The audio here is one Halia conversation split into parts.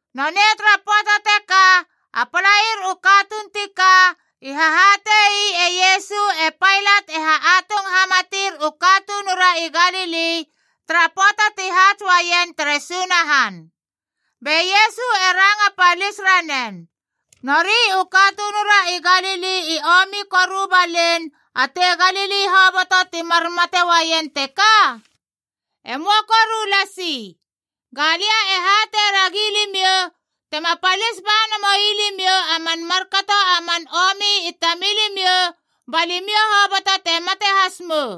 Nonei tara pöata teka, a palair u katuun ti ka, i hahatei e Iesu e Pailat e ha atung hamatir u katunura i Galili tara pöata ti haats uaien tere Sunahan. Be Iesu e ranga palis ranen, “Nori u katunura i Galili i omi koru balein a tei Galili hoboto ti mar mate uaien teka? E möa koru lasi. Ga lia e hatei ragi limiou, tema palis ba namoui limiou a man markato a man omi i tamilimiou, ba limiou hoboto te mate has mou!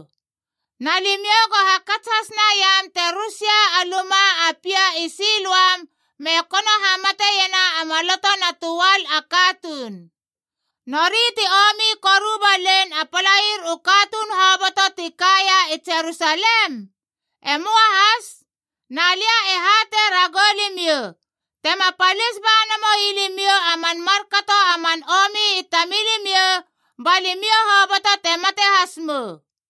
Na limiou go hakats has naiam te rus ia a luma a pia i Siloam me kono hamatiena a maloto na töal a katuun. Nori ti omi koru balein a palair u katuun hoboto ti kaia i Jerusalem? E möa has. Na lia e hatei ragou limiou, tema palis ba namoui limiou a man markato a man omi i tamilimiou, ba limiou hoboto te mate has mou!”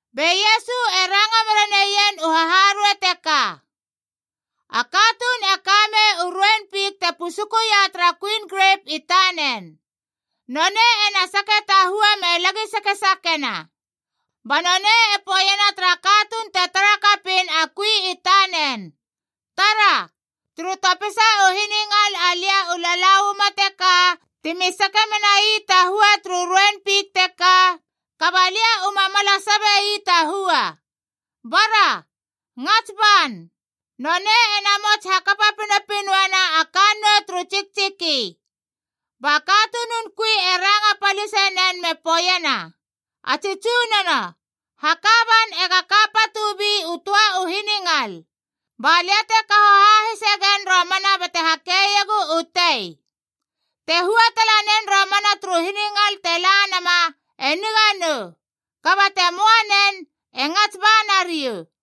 Be Iesu e ranga mera neien u haharuei teka. “A katuun e ka mei u ruein fik te pusukuia tara kuin grep i tanen. Nonei e na sake ta hua me lagi sakesakena. Ba nonei e poeiena tara katuun te tara kapiin a kui i tanen, ‘Tara, turu topisa u hiningal alia u lala uama teka timi sake menai ta hua turu ruein fik teka, kaba lia u ma mala sabe ii ta hua. Bara, ngats ban! Nonei e namots hakapa pinopinoena a kannou turu tsiktsiki.’ Ba katunun kui e ranga palisenen me poeiena, ‘A tsi tsunono, haka ban ega ka patubi u töa u hiningal. Ba lia te kaho hahise gen romana bate hakeiegu u tei. Te hua tala nen romana turu hiningal te la nama, e niga nou. Kaba te möa nen, e ngats ba nariou.’”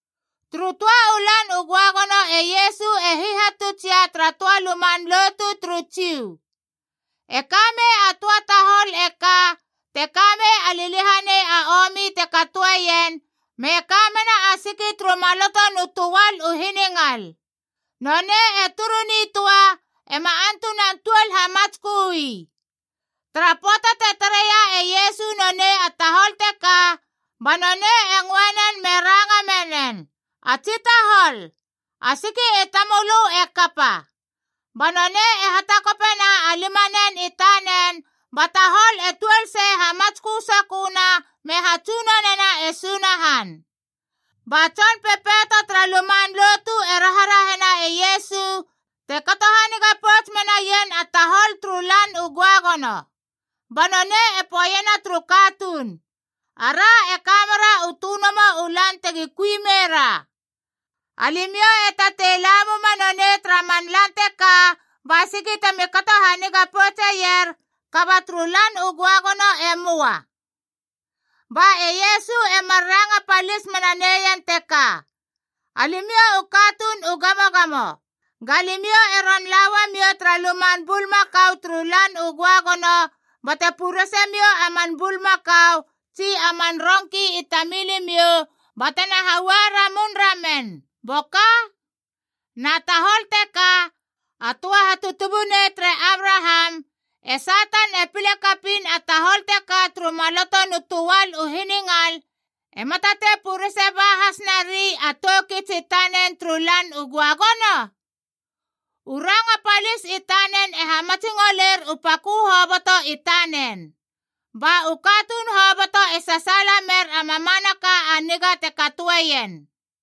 Turu töa u Lan u Göagono e Iesu e hihatutsia tara töa luman lotu turu Jiu. E ka mei a töa tahol e ka, te ka mei a liliahanei a omi te katoeien me ka mena a siki turu maloto nu töal u hiningal. Nonei e turu nitöa, ema antunan tuol hamatskö ii. Tara pöata te tareia e Iesu nonei a tahol teka, ba nonei e ngöe nen me ranga menen, “A tsi tahol, a siki i tamölö e kapa!” Ba nonei e hatakopena a limanen i tanen ba tahol e tuol sei hamatskö soköna me hatsunonena e Sunahan! Ba tson pepeito tara luman lotu e raharahena e Iesu te kato haniga pouts menaien a tahol turu Lan u Göagono. Ba nonei e poeiena turu katuun, “Ara e ka mera u tönomo u lan tegi kui meira. Alimiou e tatei la muma nonei tara man lan teka ba siki temi kato haniga poutseier, kaba turu Lan u Göagono e möa!” Ba e Iesu e mar ranga palis mena neien teka, “Alimiou u katuun u gamogamo! Ga limiou e ron la uamiou tara luman bulmakau turu Lan u Göagono bate purese miou a man bulmakau tsi a man rongki i tamilimiou batena haua ramun ramen, boka? Na tahol teka, a töa hatutubunei tere Abraham, e Satan e pile kapiin a tahol teka turu maloto nu töal u hiningal, ema tatei purese ba has nari a tou kits i tanen turu Lan u Göagono?” U ranga palis i tanen e hamatsingoler u pakö hoboto i tanen. Ba u katuun hoboto e sasaala mer a mamanaka a niga te katoeien.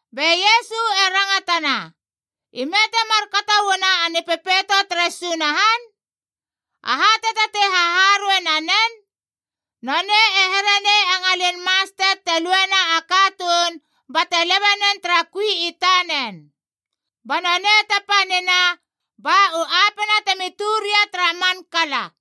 Be Iesu e rangatana, “Ime te markato uana a Nipepeito tere Sunahan? Aha te tatei haharuei nanen? Nonei e here nei a ngalin mastet te luena a katuun bate lebe nen tara kui i tanen. Ba nonei te panina, ba u apena temi tö ria tara man kala.”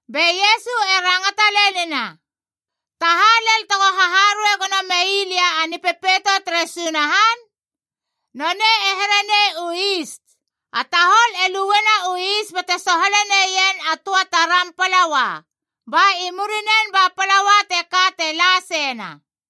Be Iesu e rangata lenina, “Ta ha lel tego haharuei gono mei lia a Nipepeito tere Sunahan? Nonei e here nei u is. A tahol e luena u is bate sohale neien a töa taram palaua, ba i murinen ba palaua teka te la seina.”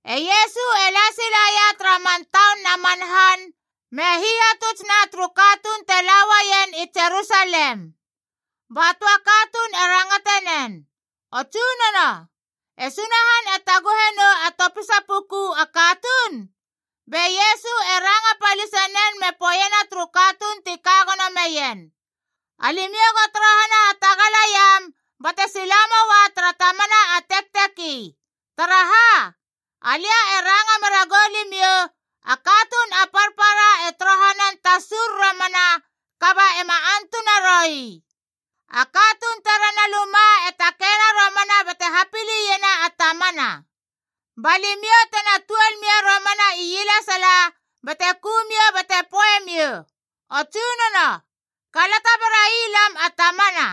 E Iesu e la silaia tara man taun na man han, me hihatuts na turu katuun te la uaien i Jerusalem. Ba töa katuun e rangate nen, “O Tsunono, e Sunahan e taguhe nou a topisa puku a katuun?” Be Iesu e ranga palise nen me poeiena turu katuun ti ka gono meien, “Alimiou go torohana hatagalaiam bate sila moua tara tamana a tekteki. Taraha? Alia e ranga mera goulimiou, a katuun a parpara e torohanan tasur romana kaba ema antuna roui. A katuun terena luma e takeina romana bate hapiliena a tamana. Ba limiou tena tuol mia romana ielesala bate ku miou bate poei miou, ‘O Tsunono, kalata berai lam a tamana!’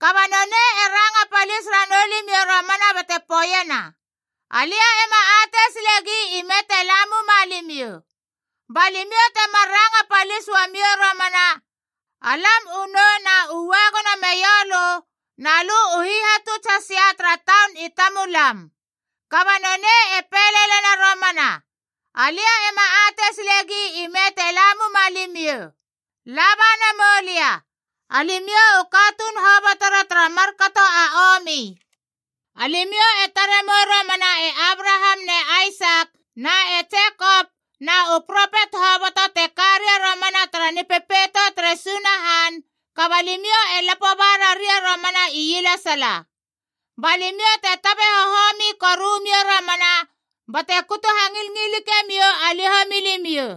Kaba nonei e ranga palis ranou limiou romana bate poeiena, ‘Alia ema atei silegi ime te la muma limiou!’ Ba limiou temar ranga palis uamiou romana, ‘Alam u nou na ua gono meiou lö, na lö u hihatuts hasia tara taun i tamulam!’ Kaba nonei e pei lelena romana, ‘Alia ema atei silegi ime te la muma limiou. Laba namou lia, alimiou u katuun hobotora tara markato a omi!’ Alimiou e tare mou romana e Abraham ne Aisak na e Jekop na u propet hoboto te ka ria romana tara Nipepeito tere Sunahan, kaba limiou e lapo ba raria romana ielesala. Ba limiou te tabe hohomi koru miou romana bate kutu hangilngilike miou a liho milimiou.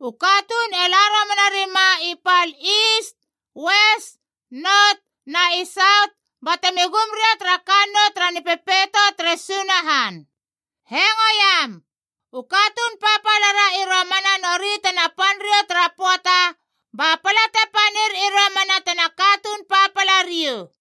U katuun e la romana rima i pal Iis, Ues, Not, na i Saut, batemi gum ria tara kannou tara Nipepeito tere Sunahan. Hengoiam, u katuun papala ra i romana nori tena pan riou tara pöata, ba pala te panir i romana tena katuun papala riou!”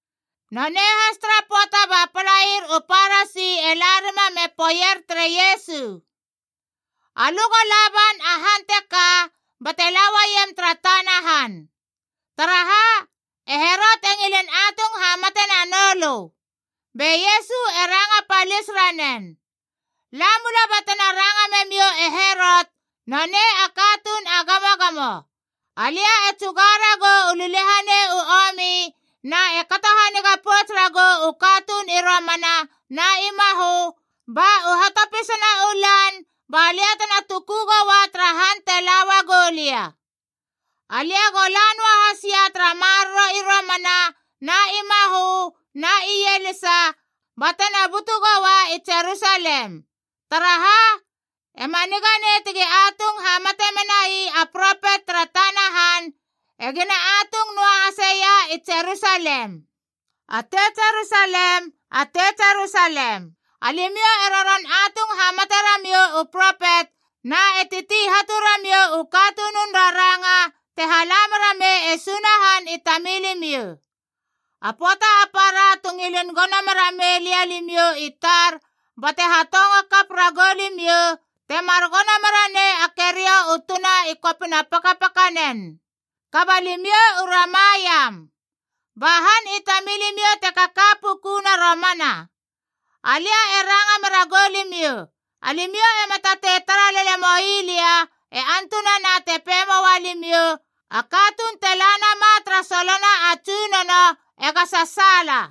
Nonei has tara pöata ba palair u Parasi e la rima me poeier tere Iesu, “Alö go la ban a han teka bate la uaiem tara tana han. Taraha? E Herot e ngilin atung hamate na noulö!” Be Iesu e ranga palis ranen, “La mula batena ranga memiou Herot nonei a katuun a gamogamo, ‘Alia e tsuga ragou u liliahanei u omi na e kato haniga pouts ragou u katuun i romana na i mahö, ba u hatopisana u lan ba lia tena tuku goua tara han te la uagu lia.’ Alia go la noa hasia tara maroro i romana na i mahö na ielisa, batena butu goua i Jerusalem. Taraha? E ma niga nei tegi atung hamate menai a propet tara tana han, egina atung noahasia i Jerusalem. “A tei Jerusalem, a tei Jerusalem! Alimiou e roron atung hamate ramiou u propet na e titi hatu ramiou u katunun raranga te hala mera mei e Sunahan i tamilimiou. A pöata a para tu ngilin gono mera mei lia limiou i tar bate hatongo kap ragou limiou, temar gono mera nei a keriou u tuna i kopina pakapakanen. Kaba limiou u rama iam! Ba han i tamilimiou te kaka pukuna romana. Alia e ranga mera goulimiou, alimiou ema tatei tara lele moi lia e antunana te pei moa limiou, ‘A katuun te la nama tara solona a Tsunono ega sasaala!’”